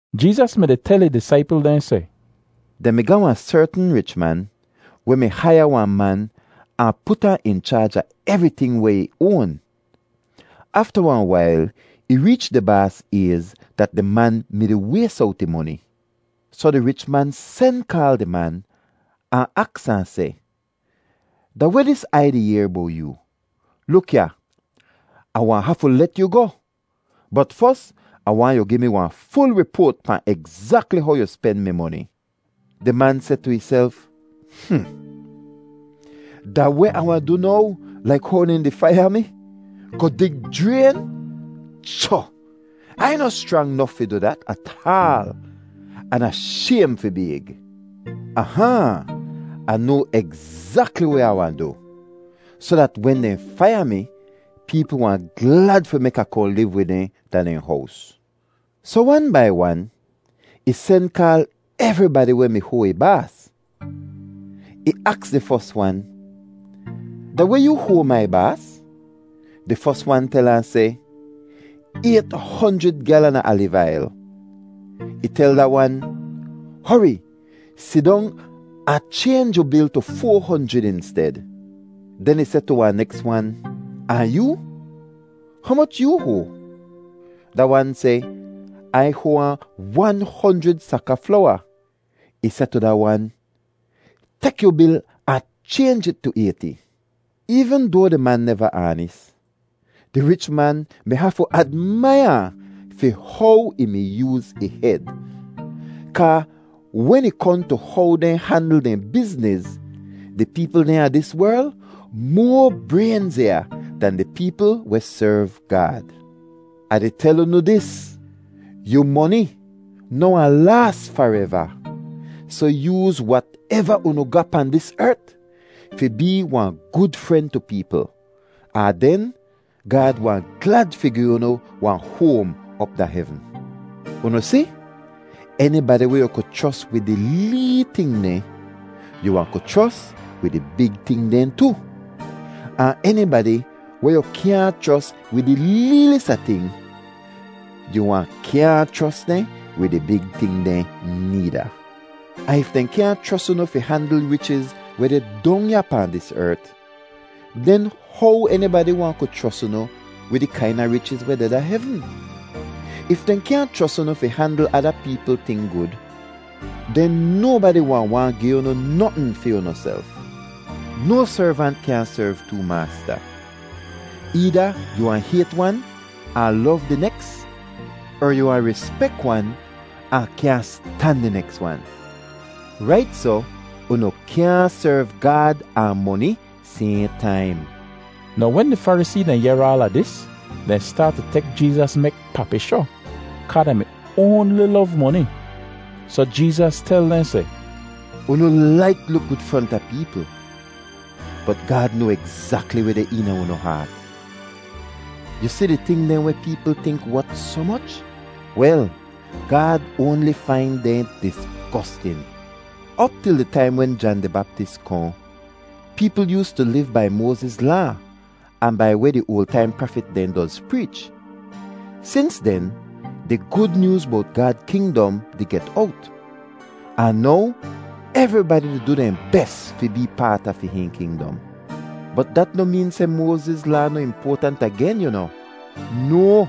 Jeezas mi-di tel ih disaipl dehn seh, “Dehn mi ga wahn sertn rich man weh mi haiya wahn man ahn put ahn in chaaj a evriting weh ih oan. Afta wahn wail ih reech di baas ayz dat di man mi-di ways owt ih moni. Soh di rich man sen kaal di man ahn aks ahn seh, ‘Da weh dis Ai di yehr bowt yoo? Luk ya, Ah wahn hafu let yu goh, bot fos Ah waahn yu gi mi wahn ful ripoat pahn egzakli how yu spen mi moni.’ “Di man seh tu ihself, ‘Hmm! Da weh Ah wahn du now laik how dehn di faiya mi, goh dig jrayn? Cho! Ai noh schrang nof fi du dat ataal, an Ah shaym fi bayg. Ah-haahn! Ah noa egzakli weh Ah wahn du, soh dat wen dehn faiya mi, peepl wahn glad fi mek Ah kohn liv wid dehn da dehn hows.’ Soh wan bai wan, ih sen kaal evribadi weh mi hoa ih baas. Ih aks di fos wan, ‘Da weh yoo hoa mai baas?’ “Di fos wan tel ahn seh, ‘Ayt honjrid gyalan a aliv ail.’ “Ih tel da wan, ‘Hori sidong ahn chaynj yu bil tu foa honjrid insted.’ “Den ih seh tu wahn neks wan, ‘Ahn yoo, humoch yoo hoa?’ “Da wan seh, ‘Ai hoa ahn wan honjrid sak a flowa.’ “Ih seh tu da wan, ‘Tek yu bil ahn chaynj it tu ayti.’ “Eevn doa di man neva aanis, di rich man mi hafu admaiya ahn fi how ih mi yooz ih hed; kaa wen ih kohn tu how dehn handl dehn bizniz, di peepl dehn a dis werl moa braynziya dan di peepl weh serv Gaad. “Ah di tel unu dis, yu moni noh wahn laas fareva, soh yooz wateva unu ga pahn dis ert fi bee wahn gud fren tu peepl, ahn den Gaad wahn glad fi gi unu wahn hoam op da hevn. Unu si, enibadi weh yu ku chros wid di lee ting dehn, yu wahn ku chros wid di big ting dehn tu. Ahn enibadi weh yu kyaahn chros wid di leelis a ting, yu wahn kyaahn chros dehn wid di big ting dehn needa. Ahn if dehn kyaahn chros unu fi handl richiz weh deh dong ya pahn dis ert, den how enibadi wahn ku chros unu wid di kaina richiz weh deh da hevn? If dehn kyaahn chros unu fi handl ada peepl ting gud, den nobadi wahn waahn gi unu notn fi unuself. “No servant kyaahn serv too maasta. Eeda yu wahn hayt wan ahn lov di neks, er yu wahn rispek wan ahn kyaahn stan di neks wan. Rait soh, unu kyaahn serv Gaad ahn moni sayhn taim.” Now wen di Farisee dehn yehr aala dis, dehn staat tu tek Jeezas mek papishoh kaa dehn mi oanli lov moni. Soh Jeezas tel dehn seh, “Unu laik luk gud fronta peepl, bot Gaad noa egzakli weh deh eena unu haat. Yu si di ting dehn weh peepl tink wot soh moch? Wel, Gaad oanli fain dehn disgostin! “Op til di taim wen Jan di Baptis kohn, peepl yoostu liv bai Moaziz Laa ahn bai weh di oal taim prafit dehn doz preech. Sins den di Gud Nyooz bowt Gaad kingdom di get owt, ahn now evribadi di du dehn bes fi bee paat a fi hihn kingdom. Bot dat noh meen seh Moaziz Laa noh impoatant agen, yu noh. No!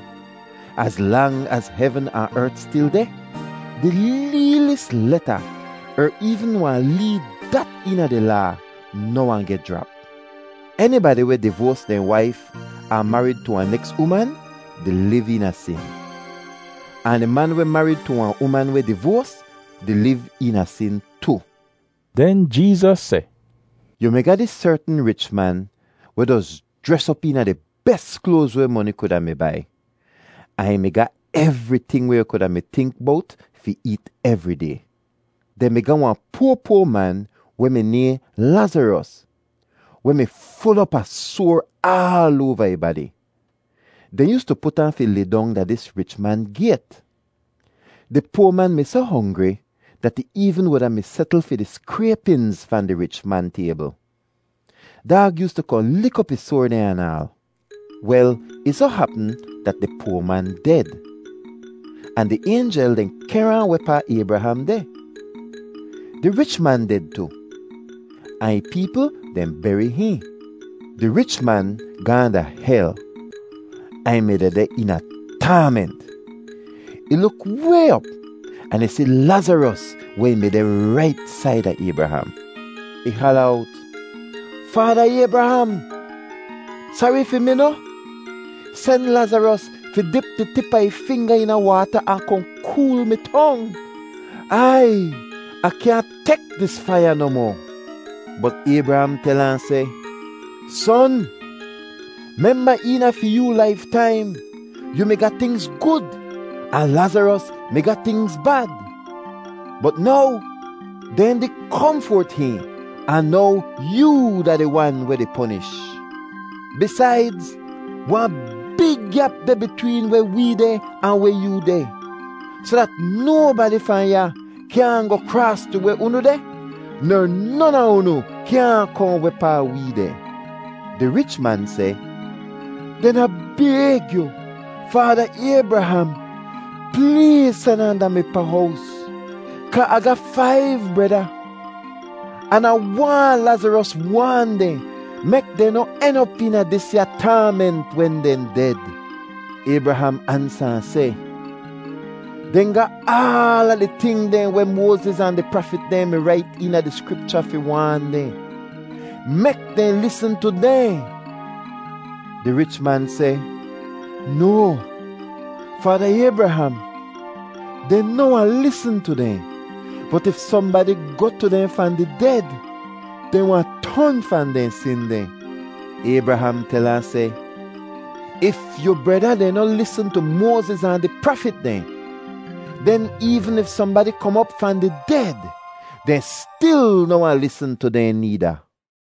Az lang az hevn ahn ert stil deh, di leelis leta er eevn wan lee dat eena di Laa noh wahn geh jrap. “Enibadi weh divoas dehn waif ahn marid tu wahn neks uman di liv eena sin. Ahn di man weh marid tu wahn uman weh divoas di liv eena sin tu.” Den Jeezas seh, “Yu mi ga dis sertn rich man weh doz jres op eena di bes kloaz weh moni kuda mi bai, ahn ih mi ga evriting weh yu kuda mi tink bowt fi eet evri day. Dehn mi ga wahn poa poa man weh mi nayhn Lazaros weh mi ful op a soar aal oava ih badi. Dehn yoostu put ahn fi lidong da dis rich man gayt. Di poa man mi soh hongri dat ih eevn wuda mi setl fi di skraypinz fahn di rich man taybl. Daag yoostu kohn lik op ih soar dehn anaal. “Wel, ih soh hapm dat di poa man ded, ahn di aynjel dehn kehr ahn wehpaa Aybraham deh. Di rich man ded tu, ahn ih peepl dehn beri hihn. Di rich man gaahn da hel ahn ih mi dehdeh eena taament. Ih luk way op ahn ih si Lazaros weh ih mi deh rait saida Aybraham. “Ih hala owt, ‘Faada Aybraham! Sari fi mi noh? Sen Lazaros fi dip di tip a ih finga eena waata ahn kohn kool mi tong. Aiy! Ah kyaahn tek dis faiya nohmoh!’ “Bot Aybraham tel ahn seh, ‘Son, memba eena fi yoo laiftaim, yoo mi ga tingz gud ahn Lazaros mi ga tingz bad. Bot now dehn di komfert hihn, ahn now yoo da di wan weh di ponish. Bisaidz, wahn big gyap deh bitween weh wee deh ahn weh yoo deh, soh dat nobadi fahn ya kyaahn goh kraas tu weh unu deh, ner non a unu kyaahn kohn wehpaa wee deh.’ “Di rich man seh, ‘Den Ah bayg yu, Faada Aybraham, pleez sen ahn da mi pa hows, kaa Ah ga faiv breda, an Ah waahn Lazaros waan dehn mek dehn noh en op eena disya taament wen dehn ded.’ “Aybraham ansa ahn seh, ‘Dehn ga aala di ting dehn weh Moaziz ahn di prafit dehn mi rait eena di Skripcha fi waan dehn. Mek dehn lisn tu dehn.’ “Di rich man seh, ‘No, Faada Aybraham. Dehn noh wahn lisn tu dehn. Bot if sohnbadi goh tu dehn fahn di ded, dehn wahn ton fahn dehn sin dehn.’ “Aybraham tel ahn seh, ‘If yu breda dehn noh lisn tu Moaziz ahn di prafit dehn, den eevn if sohnbadi kom op fahn di ded, dehn stil noh wahn lisn tu dehn needa.’”